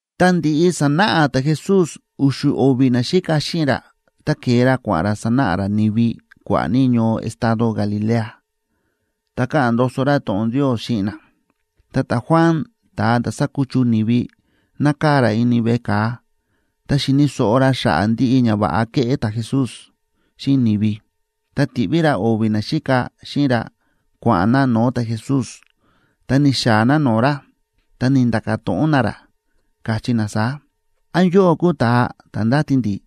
Tá ndi̱ꞌi sa̱náꞌa ta̱Jesús u̱xu̱ o̱vi̱ naxíka xíꞌin ra, ta ke̱e ra kua̱ꞌa̱n ra sánáꞌa ra ni̱vi kua̱ꞌa̱ ní ñoo estado Galilea, ta káꞌa̱n ndoso ra to̱ꞌon Ndios xíꞌin na. Ta ta̱Juan ta̱a ta̱ sa̱kuchu ni̱vi, nákaa̱ ra ini veꞌe ka̱a, ta xi̱ni̱ so̱ꞌo ra xa̱ꞌa̱ ndiꞌi ñava̱ꞌa kéꞌé ta̱Jesús xíꞌin ni̱vi, ta ti̱ꞌví ra o̱vi̱ naxíka xíꞌin ra kua̱ꞌa̱n na no̱o̱ ta̱Jesús, ta ni̱xaa̱ na no̱o̱ ra, ta ni̱nda̱ka̱ to̱ꞌon na ra, káchí na saá: ―¿Án yóꞌó kúu ta̱a ta̱ ndáti ndi̱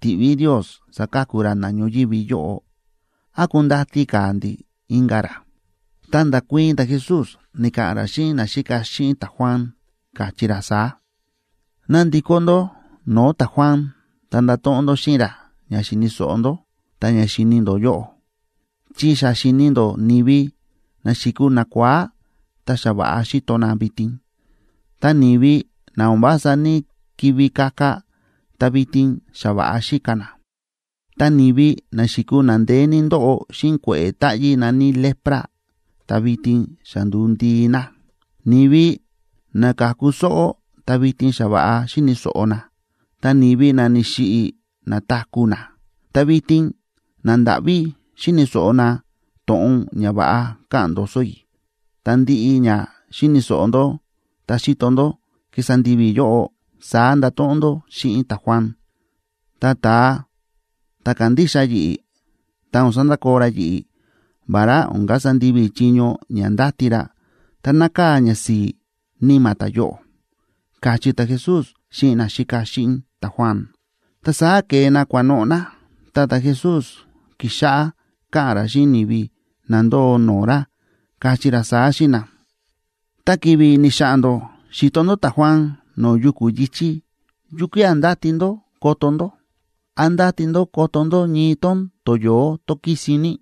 tiꞌví Ndios saka̱ku ra na ñoyívi yóꞌo, án kundati ka̱ ndi̱ inka̱ ra? Ta nda̱kuii̱n ta̱Jesús, ni̱ka̱ꞌa̱n ra xíꞌin naxíka xíꞌin ta̱Juan, káchí ra saá: ―Ná ndikó ndó no̱o̱ ta̱Juan, ta ndato̱ꞌon ndó xíꞌin ra ña xíni̱ so̱ꞌo ndó ta ña xíni ndó yóꞌo. Chi xa xi̱ni ndó ni̱vi na xi̱kuu nakua̱á, ta xa va̱ꞌa xíto na vitin. Ta ni̱vi na o̱n vása ní‑kivi kaka, ta vitin xa va̱ꞌa xíka na. Ta ni̱vi na xi̱kuu na ndeé ní ndóꞌo xíꞌin kue̱ꞌe̱ táꞌyí na̱ní lepra, ta vitin xa ndu̱u ndii na. Ni̱vi na ka̱ku sóꞌó, ta vitin xa va̱ꞌa xíni̱ so̱ꞌo na. Ta ni̱vi na ni̱xiꞌi̱, na̱taku̱ na. Ta vitin nandáꞌví xíni̱ so̱ꞌo na to̱ꞌon ñava̱ꞌa káꞌa̱n ndoso i̱. Ta ndiꞌi ña xi̱ni̱ so̱ꞌo ndó ta xi̱to ndó kísa ndivi i̱ yóꞌo, saá ndato̱ꞌon ndó xíꞌin ta̱Juan. Ta ta̱a ta̱ kándixa yi̱ꞌi̱, tá o̱n sandakoo ra yi̱ꞌi̱, vará o̱n kasa ndivi i̱ chiño ña ndáti ra, ta nákaa̱ ñasi̱i̱ níma̱ ta̱yóꞌo ―káchí ta̱Jesús xíꞌin naxíka xíꞌin ta̱Juan. Ta saá ke̱e na kua̱noꞌo̱ na, ta ta̱Jesús ki̱xáꞌá káꞌa̱n ra xíꞌin ni̱vi na ndóo no̱o̱ ra, káchí ra saá xíꞌin na: ―Ta ki̱vi̱ ni̱xa̱ꞌa̱n ndó xi̱to ndó ta̱Juan no̱o̱ yuku̱ yi̱chí, ¿yukía̱ ndáti ndó koto ndó? ¿Án ndáti ndó koto ndó ñii tón toyo̱ó tón kísin ní,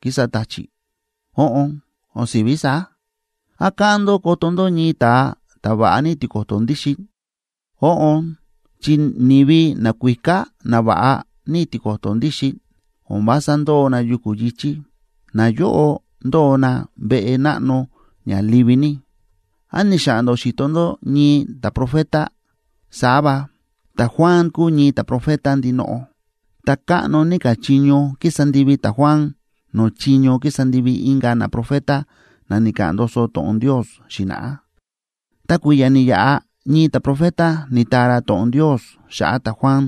kísa ta̱chi̱? Óꞌon, o̱n si̱ví saá. ¿Án káꞌán ndó koto ndó ñii ta̱a ta̱ va̱ꞌa ní tiko̱to̱ ndíxin? Óꞌon, chi ni̱vi nakuíká na va̱ꞌa ní tiko̱to̱ ndíxin o̱n vása ndóo na yuku̱ yi̱chí, nayóꞌo ndóo na veꞌe náꞌno ña livi ní. ¿Án ni̱xa̱ꞌa̱n ndó xi̱to ndó ñii ta̱profeta? Saá va, ta̱Juan kúu ñii ta̱profeta ndinoꞌo, ta káꞌno ní ka̱ chiño ki̱sa ndivi ta̱Juan no̱o̱ chiño ki̱sa ndivi inka̱ naprofeta na ni̱ka̱ꞌa̱n ndoso to̱ꞌon Ndios xi̱na̱ꞌá. Ta kui̱ya̱ ni̱yaꞌa ñii ta̱profeta ni̱taa ra to̱ꞌon Ndios xa̱ꞌa̱ ta̱Juan,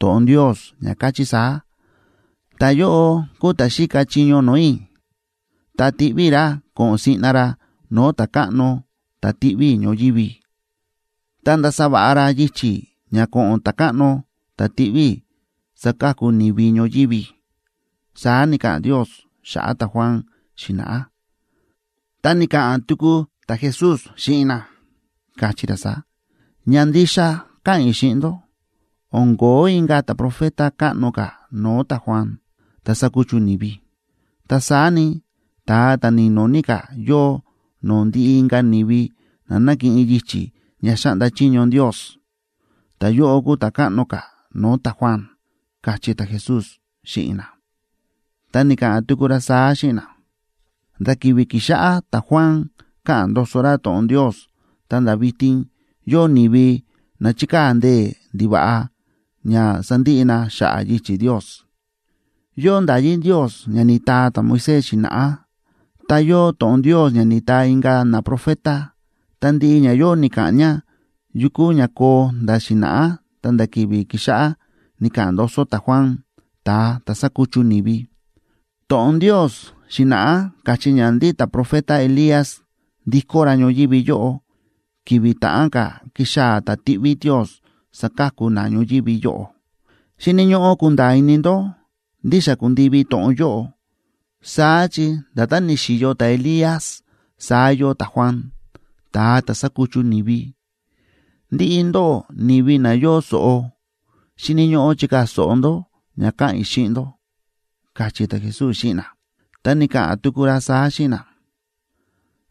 to̱ꞌon Ndios ña káchí saá: Ta̱yóꞌo kuu ta̱ xíka chiño no̱o̱ i̱, ta tiꞌví i̱ ra ko̱ꞌo̱n siꞌna ra no̱o̱ Ta̱káꞌno ta̱ tiꞌví i̱ ñoyívi. Ta ndasa va̱ꞌa ra yichi̱ ña ko̱ꞌo̱n Ta̱káꞌno ta̱ tiꞌví i̱ saka̱ku ni̱vi ñoyívi, saá ni̱ka̱ꞌa̱n Ndios xa̱ꞌa̱ ta̱Juan xi̱na̱ꞌá. Ta ni̱ka̱ꞌa̱n tuku ta̱Jesús xíꞌin na, káchí ra saá: ―Ña ndixa káꞌa̱n i̱ xíꞌin ndó, o̱n ko̱ó inka̱ ta̱profeta káꞌno ka̱ no̱o̱ ta̱Juan, ta̱ sa̱kuchu ni̱vi. Ta saá ni, ta̱a ta̱ ni̱no̱ ní ka̱ yóo no̱o̱ ndiꞌi inka̱ ni̱vi na nákiꞌin yichi̱ ña xáꞌnda chiño Ndios, ta ta̱yóꞌo kúu ta̱ káꞌno ka̱ no̱o̱ ta̱Juan ―káchí ta̱Jesús xíꞌin na. Ta ni̱ka̱ꞌa̱n tuku ra saá xíꞌin na: ―Nda̱ ki̱vi̱ ki̱xáꞌá ta̱Juan káꞌa̱n ndoso ra to̱ꞌon Ndios ta̱nda̱ vitin, yóo ni̱vi na chíkaa̱ ndee̱ ndiva̱ꞌa ña sandiꞌi na xa̱ꞌa̱ yichi̱ Ndios. Yóo nda̱yí Ndios ña ni̱taa ta̱Moisés xi̱na̱ꞌá, ta yóo to̱ꞌon Ndios ña ni̱taa inka̱ naprofeta. Ta ndiꞌi ñayóꞌo ni̱ka̱ꞌa̱n ña yu kúu ña koo nda̱ xi̱na̱ꞌá ta̱nda̱ ki̱vi̱ ki̱xáꞌá ni̱ka̱ꞌa̱n ndoso ta̱Juan, ta̱a ta̱ sa̱kuchu ni̱vi. To̱ꞌon Ndios xi̱na̱ꞌá káchí ña ndí ta̱profeta Elías ndikó ra ñoyívi yóꞌo ki̱vi̱ ta̱ꞌán ka̱ kixaa̱ ta̱ tiꞌví Ndios saka̱ku na ñoyívi yóꞌo. Xíni̱ ñóꞌó kunda̱a̱ ini ndó ndí xa ku̱ndivi to̱ꞌon yóꞌo, saá chi nda̱tán ni̱xi̱yo ta̱Elías saá yóo ta̱Juan, ta̱a ta̱ sa̱kuchu ni̱vi. Ndiꞌi ndóꞌó ni̱vi na yóo so̱ꞌo, xíni̱ ñóꞌó chikaa̱ so̱ꞌo ndó ña káꞌa̱n i̱ xíꞌin ndó ―káchí ta̱Jesús xíꞌin na. Ta ni̱ka̱ꞌa̱n tuku ra saá xíꞌin na: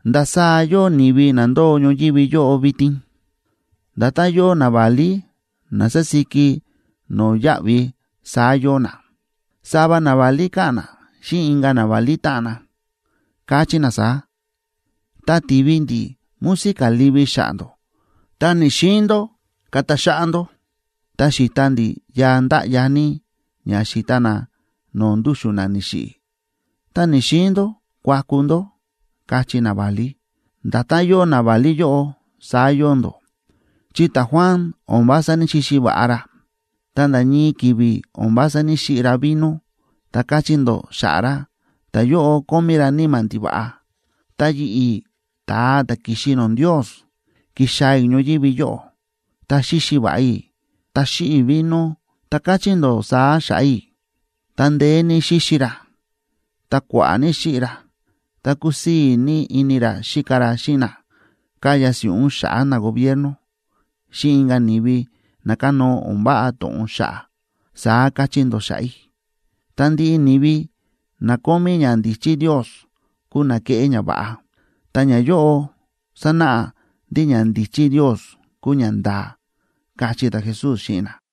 ―¿Ndasaá yóo ni̱vi na ndóo ñoyívi yóꞌo vitin? Nda̱tán yóo naválí na sásíki no̱yáꞌvi, saá yóo na. Sava naválí káꞌa̱n na xíꞌin inka̱ naválí táꞌan na, káchí na saá: “Tá ti̱vi ndi̱ música livi xa̱ꞌa̱ ndó, ta ni̱‑xiin ndó kata xáꞌá ndó. Tá xi̱ta ndi̱ yaa ndáꞌya ní ña xíta na no̱o̱ ndúxu̱n na ni̱xiꞌi̱, ta ni̱‑xiin ndó kuaku ndó”, káchí naválí. Nda̱tán yóo naválí yóꞌo, saá yóo ndó, chi ta̱Juan o̱n vása ní‑xixi va̱ꞌa ra, ta nda̱ ñii ki̱vi̱ o̱n vása ní‑xiꞌi ra vino, ta káchí ndó xa̱ꞌa̱ ra: “Ta̱yóꞌo kómí ra níma̱ ndiva̱ꞌa.” Ta yi̱ꞌi̱, ta̱a ta̱ ki̱xi no̱o̱ Ndios, ki̱xaa̱ i̱ ñoyívi yóꞌo, ta xíxi va̱ꞌa i̱, ta xíꞌi i̱ vino, ta káchí ndó saá xa̱ꞌa̱ i̱: “Ta ndeé ní xíxi ra, ta kua̱ꞌa̱ ní xíꞌi ra. Ta kúsii̱ ní ini ra xíka ra xíꞌin na káya si̱ꞌún xa̱ꞌa̱ nagobierno, xíꞌin inka̱ ni̱vi na kánóo o̱n váꞌa to̱ꞌon xa̱ꞌa̱”, saá káchí ndó xa̱ꞌa̱ i̱. Ta ndiꞌi ni̱vi na kómí ñandíchí Ndios, kúu na kéꞌé ñava̱ꞌa, ta ñayóꞌo sánáꞌa ndí ñandíchí Ndios kúu ñanda̱a̱ ―káchí ta̱Jesús xíꞌin na.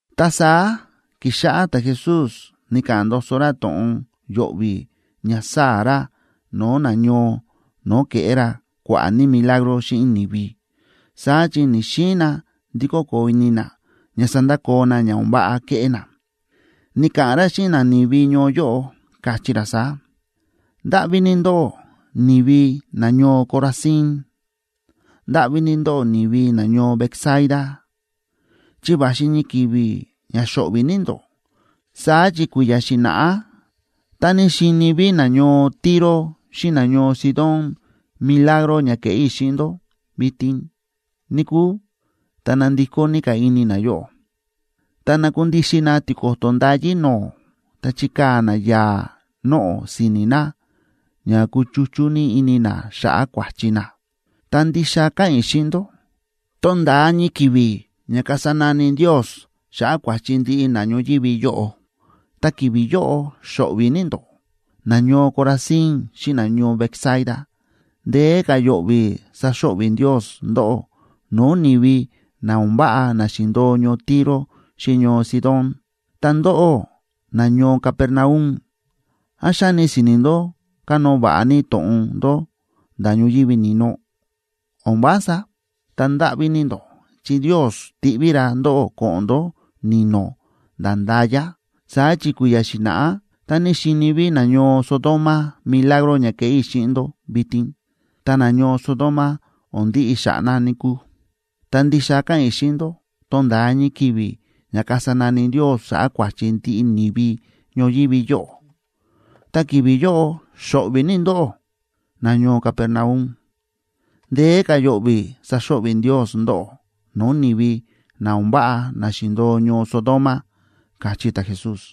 Ta saá ki̱xáꞌá ta̱Jesús ni̱ka̱ꞌa̱n ndoso ra to̱ꞌon yo̱ꞌvi̱ ña sáa̱ ra no̱o̱ nañoo no̱o̱ ke̱ꞌé ra kua̱ꞌa̱ ní milagro xíꞌin ni̱vi, saá chi ni̱‑xiin na ndikó koo ini na ña sandakoo na ña o̱n váꞌa kéꞌé na. Ni̱ka̱ꞌa̱n ra xíꞌin nani̱vi ñoo yóꞌo, káchí ra saá: ―¡Ndáꞌví ní ndó, ni̱vi nañoo Corazín! ¡Ndáꞌví ní ndó, ni̱vi nañoo Betsaida! Chi va̱xi ñii ki̱vi̱ ña xo̱ꞌvi̱ ní ndó. Saá chi kui̱ya̱ xi̱na̱ꞌá tá ní xíni ví nañoo Tiro xíꞌin nañoo Sidón milagro ña kéꞌé i̱ xíꞌin ndó vitin, níkúu, ta nandikó ní ka̱ ini nayóꞌo, ta nakundixin na tiko̱to̱ ndayí no̱o̱, ta chikaa̱ na yaa̱ noꞌo̱ si̱ni̱ na ña kúchuchú ní ini na xa̱ꞌa̱ kua̱chi na. Ta ndixa káꞌa̱n i̱ xíꞌin ndó, tonda̱a ñii ki̱vi̱ ña kasa nani Ndios xa̱ꞌa̱ kua̱chi ndiꞌi na ñoyívi yóꞌo, ta ki̱vi̱ yóꞌo xo̱ꞌvi̱ ní ndóꞌó, nañoo Corazín xíꞌin nañoo Betsaida. Ndeé ka̱ yo̱ꞌvi̱ saxo̱ꞌvi̱ Ndios ndóꞌó no̱o̱ ni̱vi na o̱n váꞌa na xi̱ndo̱o ñoo Tiro xíꞌin ñoo Sidón. Ta ndóꞌó, nañoo Capernaum, ¿án xáni si̱ni̱ ndó kanóo va̱ꞌa ní to̱ꞌon ndó nda̱ ñoyívi ni̱no? ¡O̱n vása! Ta ndáꞌví ní ndó, chi Ndios tiꞌví ra ndóꞌó ko̱ꞌo̱n ndó ni̱no̱, nda̱ nda̱ya. Saá chi kui̱ya̱ xi̱na̱ꞌá tá ní xíni ví nañoo Sodoma milagro ña kéꞌé i̱ xíꞌin ndó vitin, ta nañoo Sodoma o̱n ndiꞌi xa̱ꞌa̱ na, níkúu. Ta ndixa káꞌa̱n i̱ xíꞌin ndó, tonda̱a ñii ki̱vi̱ ña kasa nani Ndios xa̱ꞌa̱ kua̱chi ndiꞌi ni̱vi ñoyívi yóꞌo, ta ki̱vi̱ yóꞌo xo̱ꞌvi̱ ní ndóꞌó, nañoo Capernaum. Ndeé ka̱ yo̱ꞌvi̱ saxo̱ꞌvi̱ Ndios ndóꞌó no̱o̱ ni̱vi na o̱n váꞌa na xi̱ndo̱o ñoo Sodoma ―káchí ta̱Jesús.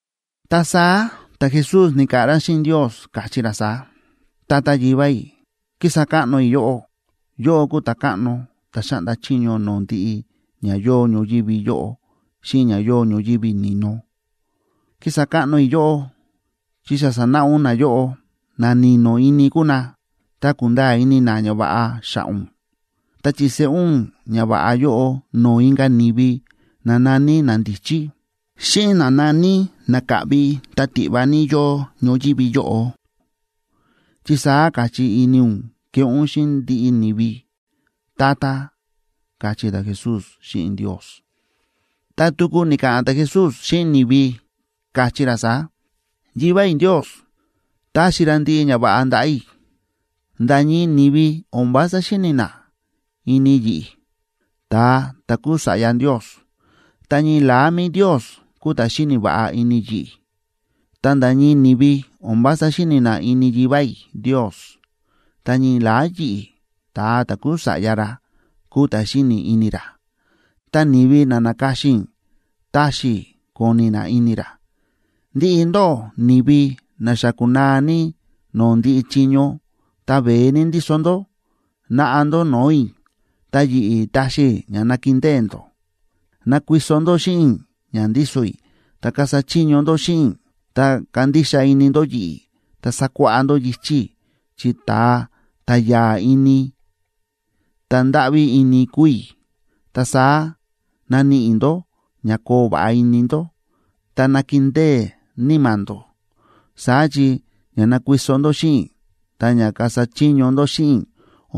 Ta saá ta̱Jesús ni̱ka̱ꞌa̱n ra xíꞌin Ndios, káchí ra saá: ―Tata Yivá i̱, kísa káꞌno i̱ yóꞌó. Yóꞌó kúu Ta̱káꞌno ta̱ xáꞌnda chiño no̱o̱ ndiꞌi ña yóo ñoyívi yóꞌo xíꞌin ña yóo ñoyívi ni̱no. Kísa káꞌno i̱ yóꞌó chi xa sa̱náꞌa ún nayóꞌo, na ni̱no̱ ini kúu na, ta kúnda̱a̱ ini na ñava̱ꞌa xa̱ꞌa̱ ún. Ta chi̱seꞌé ún ñava̱ꞌa yóꞌo no̱o̱ inka̱ ni̱vi na na̱ní nandíchí, xíꞌin na na̱ní na káꞌvi ta tiꞌva ní yóo ñoyívi yóꞌo, chi saá káchí ini ún keꞌé ún xíꞌin ndiꞌi ni̱vi, Tata ―káchí ta̱Jesús xíꞌin Ndios. Ta tuku ni̱ka̱ꞌa̱n ta̱Jesús xíꞌin ni̱vi, káchí ra saá: ―Yivá i̱ Ndios ta̱xi ra ndiꞌi ñava̱ꞌa ndaꞌa̱ i̱. Nda̱ ñii ni̱vi o̱n vása xíni̱ na ini yi̱ꞌi̱, ta̱a ta̱ kúu Sa̱ꞌya Ndios, ta ñii la̱á mi̱i Ndios kúu ta̱ xíni̱ va̱ꞌa ini yi̱ꞌi̱. Ta nda̱ ñii ni̱vi o̱n vása xíni̱ na ini Yivá i̱ Ndios, ta ñii la̱á yi̱ꞌi̱, ta̱a ta̱ kúu Sa̱ꞌya ra, kúu ta̱ xíni̱ ini ra, ta ni̱vi na na̱ka̱xin i̱ taxi i̱ koni̱ na ini ra. Ndiꞌi ndóꞌó ni̱vi na xa kúnaa ní no̱o̱ ndiꞌi chiño, ta veé ní ndíso ndó, naꞌa ndó no̱o̱ i̱, ta yi̱ꞌi̱ taxi i̱ ña nakindée ndó. Nakuiso ndó xíꞌin i̱ ña ndíso i̱ ta kasa chiño ndó xíꞌin i̱, ta kandixa ini ndó yi̱ꞌi̱, ta sakuáꞌá ndó yichi̱ i̱, chi ta̱a ta̱ ya̱a̱ ini ta̱ ndáꞌví ini kúu i̱, ta saá naníꞌi ndó ña koo va̱ꞌa ini ndó, ta nakindée níma̱ ndó. Saá chi ña nakuiso ndó xíꞌin i̱ ta ña kasa chiño ndó xíꞌin i̱,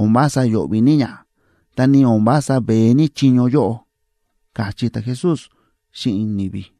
o̱n vása yo̱ꞌvi̱ ní ña, ta ni o̱n vása veé ní chiño yóꞌo ―káchí ta̱Jesús xíꞌin ni̱vi.